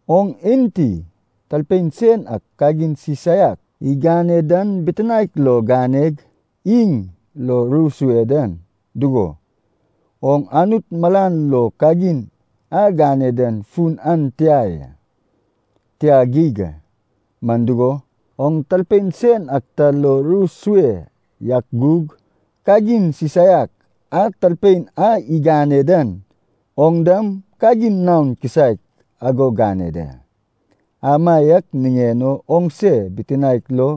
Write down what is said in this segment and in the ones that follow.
Oŋ enti talpein sen ak kagin sisaiak igane dan bitinaek lo ganeg iŋ lo ru sue dan, dugo, oŋ Anut malan lo kagin a gane dan fun an tia ya. Tia geig a, man dugo, oŋ talpein sen ak ta lo ru sue yak gug, kagin sisaiak a talpein a igane dan oŋ dam kagin naon kisaek ago gane da. Amaiak niŋen o oŋse bitinaek lo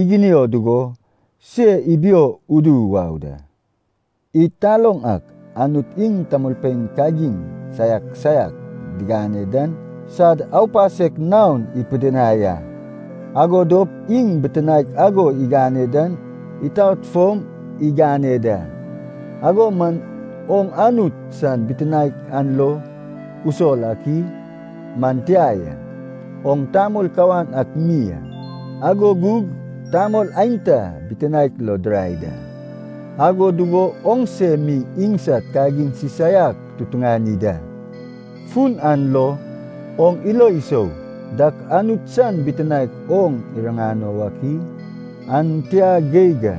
iginio dugo se ibio udu wau da. Id taloŋ ak Anut iŋ tamolpein kagin saiak saiak digane dan sad aupasek naon ipidinai a. Ago dop iŋ bitinaek ago igane dan itaot fom igane da. Ago man oŋ Anut san bitinaek an lo usol ak i? Man tia ya. Oŋ tamol kawan ak mi a, ago gug tamol aenta bitinaek lo dirai da. Ago dugo oŋse mi iŋsad kagin sisaiak tutuŋani da. Fun an lo, oŋ ilo isou dak Anut san bitinaek oŋ iriŋano wak i? An tia geig a!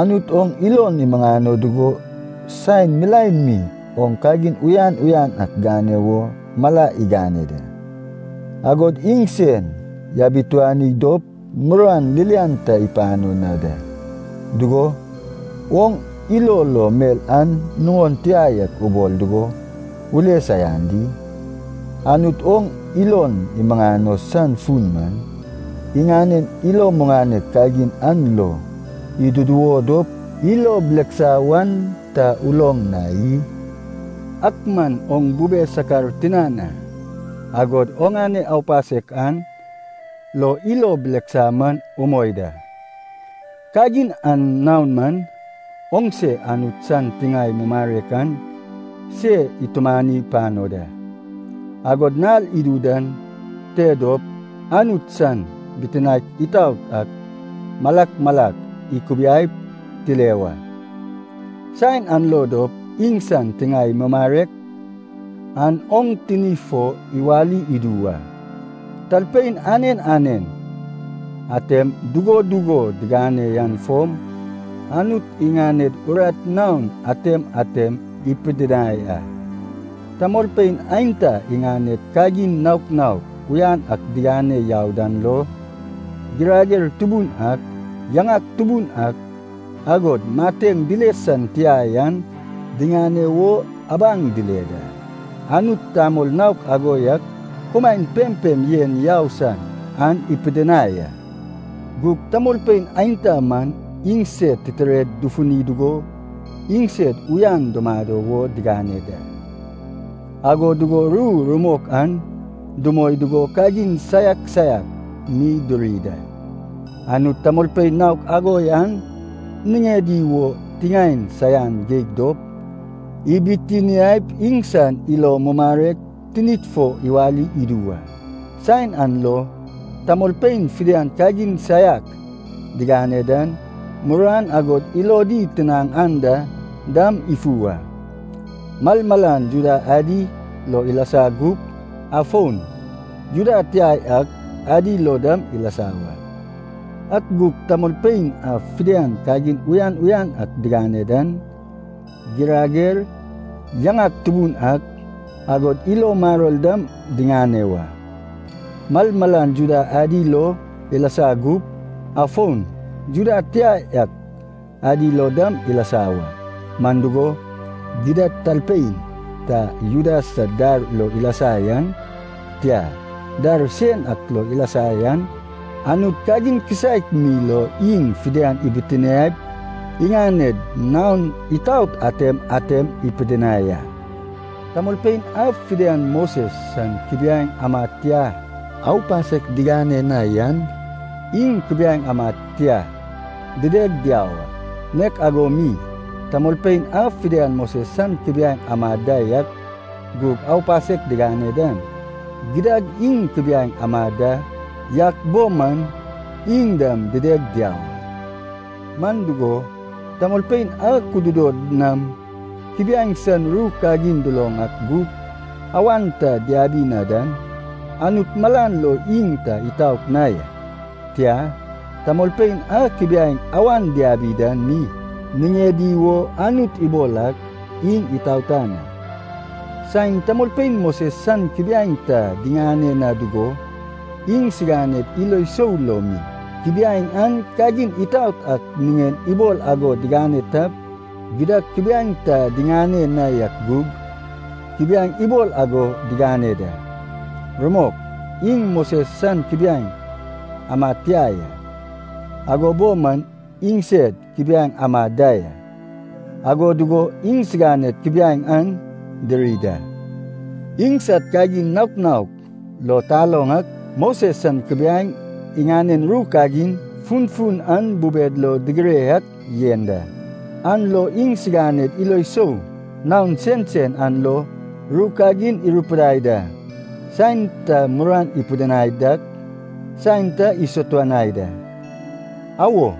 Anut oŋ ilon imuŋano dugo saen milaen mi oŋ kagin uyan uyan ak gane wo mala igane da, agod iŋsen yabituani dop muruan ririan ta ipano na da. Dugo, oŋ ilo lo mel an nuŋon tia yak ubol dugo ule saian di? Anut oŋ ilon imuŋano san fun man, iŋanen ilo muŋanek kagin an lo iduduwo dop ilo bileksa wan ta uloŋ na i? Ak man oŋ bube sakar tinan a, agod oŋane aupasek an lo ilo bileksa man umoi da. Kagin an naon man, oŋse Anut san tiŋae mumarek an se itumani pano da. Agod nal idu dan te dop Anut san bitinaek itaot ak malak malak ikubiaip tile wa, saen an lo dop iŋsan tiŋae mumarek an oŋ tini fo iwali idu wa. Talpein anen anen atem dugo dugo digane yan fom, Anut iŋaned urat naon atem atem ipidinai a. Tamolpein aenta iŋaned kagin naok naok uyan ak digane yau dan lo, girager tubun ak, yaŋak tubun ak, agod mateŋ dile san tia yan diŋane wo abaŋ dile da. Anut tamol naok ago yak kumaen pempem yen yau san an ipidinai a. Gug tamolpein aenta man, iŋsed titired dufuni dugo iŋsed uyan dumado wo digane da, ago dugo ru rumok an dumoi dugo kagin saiak saiak mi duri da. Anut tamolpein naok ago yan niŋedi wo tiŋaen saian geig dop, ibitiniaip iŋsan ilo mumarek tinid fo iwali idu wa. Saen an lo, tamolpein fidian kagin saiak digane dan, muruan agod ilodi tinaŋ anda dam ifu a, malmalan Juda adi lo ilasa gup, afon Juda tia yak adi lo dam ilasa wa. Ak gug tamolpein a fidian kagin uyan uyan ak digane dan, girager, yaŋak tubun ak, agod ilo maror dam diŋane wa, malmalan Juda adi lo ilasa gup, afon Juda tia yak adi lo dam ilasa wa. Man dugo, gidad talpein ta Juda sad dar lo ilasa yan, tia, dar sen ak lo ilasa yan, Anut kagin kisaek mi lo iŋ fidian ibitiniaip iŋaned naon itaot atem atem ipidinai a. Tamolpein a fidian Moses san kubiaeŋ amad tia aupasek digane na yan, iŋ kubiaeŋ amad tia dideg diau a. Nek ago mi, tamolpein a fidian Moses san kubiaeŋ amad da yak gug aupasek digane dan, gidad iŋ kubiaeŋ amad da yak bo man iŋ dam dideg diau a. Man dugo, tamolpein a kududod nam kubiaeŋ san ru kagin duloŋ ak gug awan ta diabi na dan, Anut malan lo iŋ ta itaot na ya. Tia, tamolpein a kubiaeŋ awan diabi dan mi niŋedi wo Anut ibol ak, iŋ itaotan a. Saen tamolpein Moses san kubiaeŋ ta diŋane na dugo, iŋsiganed ilo sou lo mi, kubiaeŋ an kagin itaot ak niŋen ibol ago digane tap, gidad kubiaeŋ ta diŋane na yak gug, kubiaeŋ ibol ago digane da. Rumok, iŋ Moses san kubiaeŋ amad tia ya, ago bo man iŋsed kubiaeŋ amad da ya, ago dugo iŋsiganed kubiaeŋ an diri da. Iŋsad kagin naok naok lo taloŋ ak, Moses san kubiaeŋ iŋanen ru kagin funfun an bubed lo digire yak yen da. An lo iŋsiganed ilo sou naon sensen an lo ru kagin irupidai da, saen ta muruan ipidinai dak, saen ta isatuanai da. Awo,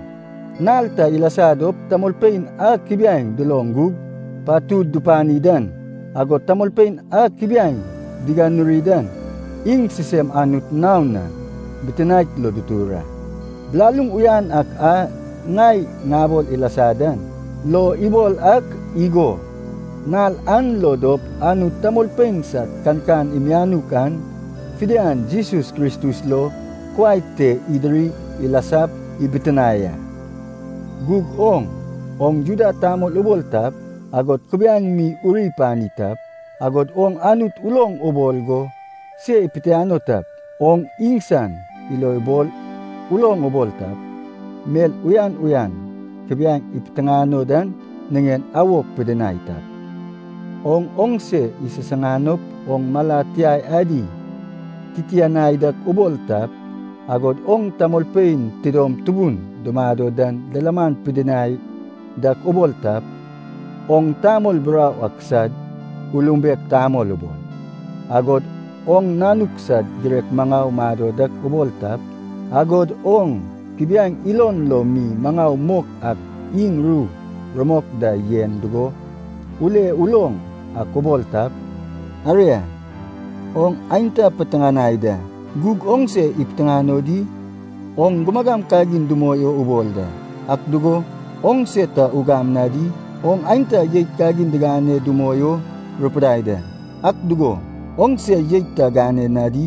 nal ta ilasa dop tamolpein a kubiaeŋ duloŋ gug patud dupani dan, agod tamolpein a kubiaeŋ diganuri dan, iŋ sisem Anut naon na bitinaek lo ditur a. Bilaluŋ uyan ak a ŋai ŋabol ilasa dan lo ibol ak igo, nal an lo dop Anut tamolpein sad kankan mianuk an fidian Jesus Kristus lo kuai te idiri ilasap ibitinae a. Gug oŋ, oŋ Juda tamol ubol tap, agod kubiaeŋ mi uri pani tap, agod oŋ Anut uloŋ ubol go se ipitiano tap, oŋ iŋsan ilobol uloŋ ubol tap, mel uyan uyan kubiaeŋ ipiteŋano dan niŋen awok pidinai tap, oŋ oŋse isisiŋanop oŋ mala tiai adi titianai dak ubol tap, agod oŋ tamolpein tidom tubun dumado dan lilaman pidinai dak ubol tap, oŋ tamol burau ak sad ulumbek tamol ubol, agod oŋ nanuk sad girek maŋau mado dak ubol tap, agod oŋ kubiaeŋ ilon lo mi maŋau mok ak iŋ ru rumok da yen dugo ule uloŋ ak ubol tap, aria, oŋ aenta piteŋanai da, gug oŋ se ipiteŋano di? Oŋ gumagam kagin dumoi o ubol da, ak dugo, oŋse ta ugam na di? Oŋ aenta jeit kagin digane dumoi o rupidai da, ak dugo, oŋse jeit ta gane na di?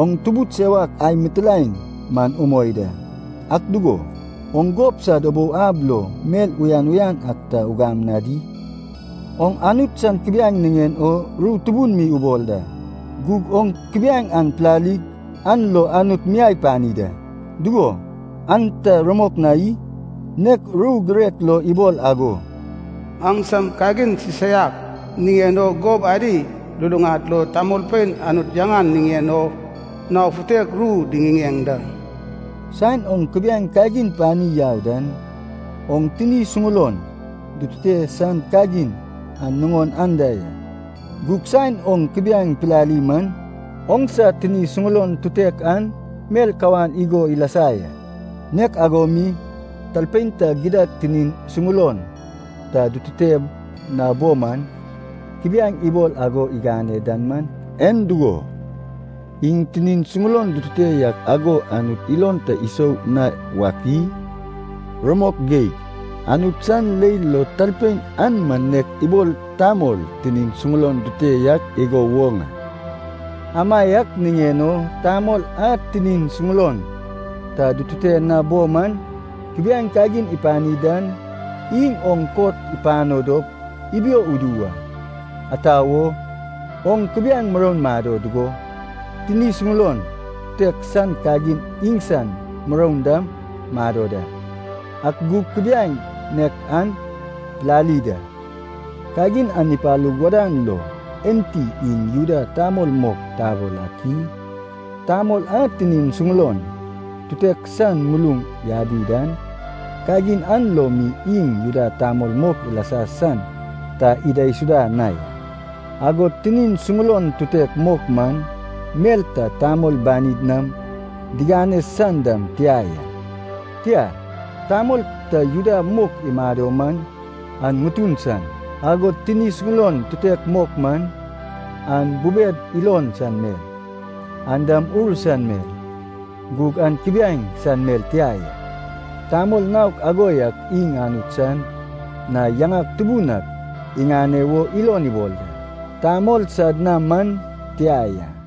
Oŋ tubud sewak ai mitilaen man umoi da, ak dugo, oŋ gob sad ubou ab lo mel uyan uyan ak ta ugam na di? Oŋ Anut san kubiaeŋ niŋen o ru tubun mi ubol da. Gug oŋ kubiaeŋ an pilalig an lo Anut miai pani da. Dugo, an ta rumok na i? Nek ru girek lo ibol ago, “Aŋsam kagin sisaiak niŋen o gob adi luluŋad lo tamolpein Anut yaŋan niŋen o nao futek ru diŋiŋeŋ da.” Saen oŋ kubiaeŋ kagin pani yau dan, oŋ tini suŋulon dutute san kagin an nuŋon anda ya. Gug saen oŋ kubiaeŋ pilali man, oŋsa tini suŋulon tutek an mel kawan igo ilasa ya. Nek ago mi, talpein ta gidad tinin suŋulon ta dutute na bo man kubiaeŋ ibol ago igane dan man, en dugo, iŋ tinin suŋulon dutute yak ago Anut ilon ta isou na wak i? Rumok geig, Anut san leil lo talpein an man nek ibol tamol tinin suŋulon dutute yak igo woŋ a. Amaiak niŋen o tamol a tinin suŋulon ta dutute na bo man kubiaeŋ kagin ipani dan, iŋ oŋ kot ipano dop ibio udu wa. Ata wo? Oŋ kubiaeŋ muroun mado dugo, tini suŋulon tutek san kagin iŋsan muroun dam mado da, ak gug kubiaeŋ nek an pilali da. Kagin an ipalug wadan lo enti iŋ Juda tamol mok tabol ak i? Tamol a tini suŋulon tutek san muluŋ yabi dan, kagin an lo mi iŋ Juda tamol mok ilasa san ta idaisuda na ya. Agod tini suŋulon tutek mok man, mel ta tamol banid nam digane san dam tia ya. Tia, tamol ta Juda mok imado man an ŋutun san, agod tini suŋulon tutek mok man, an bubed ilon san mel, an dam ur san mel, gug an kubiaeŋ san mel tia ya. Tamol naok ago yak iŋ Anut san na yaŋak tubun ak iŋane wo ilon ibol da, tamol sad na man tia ya.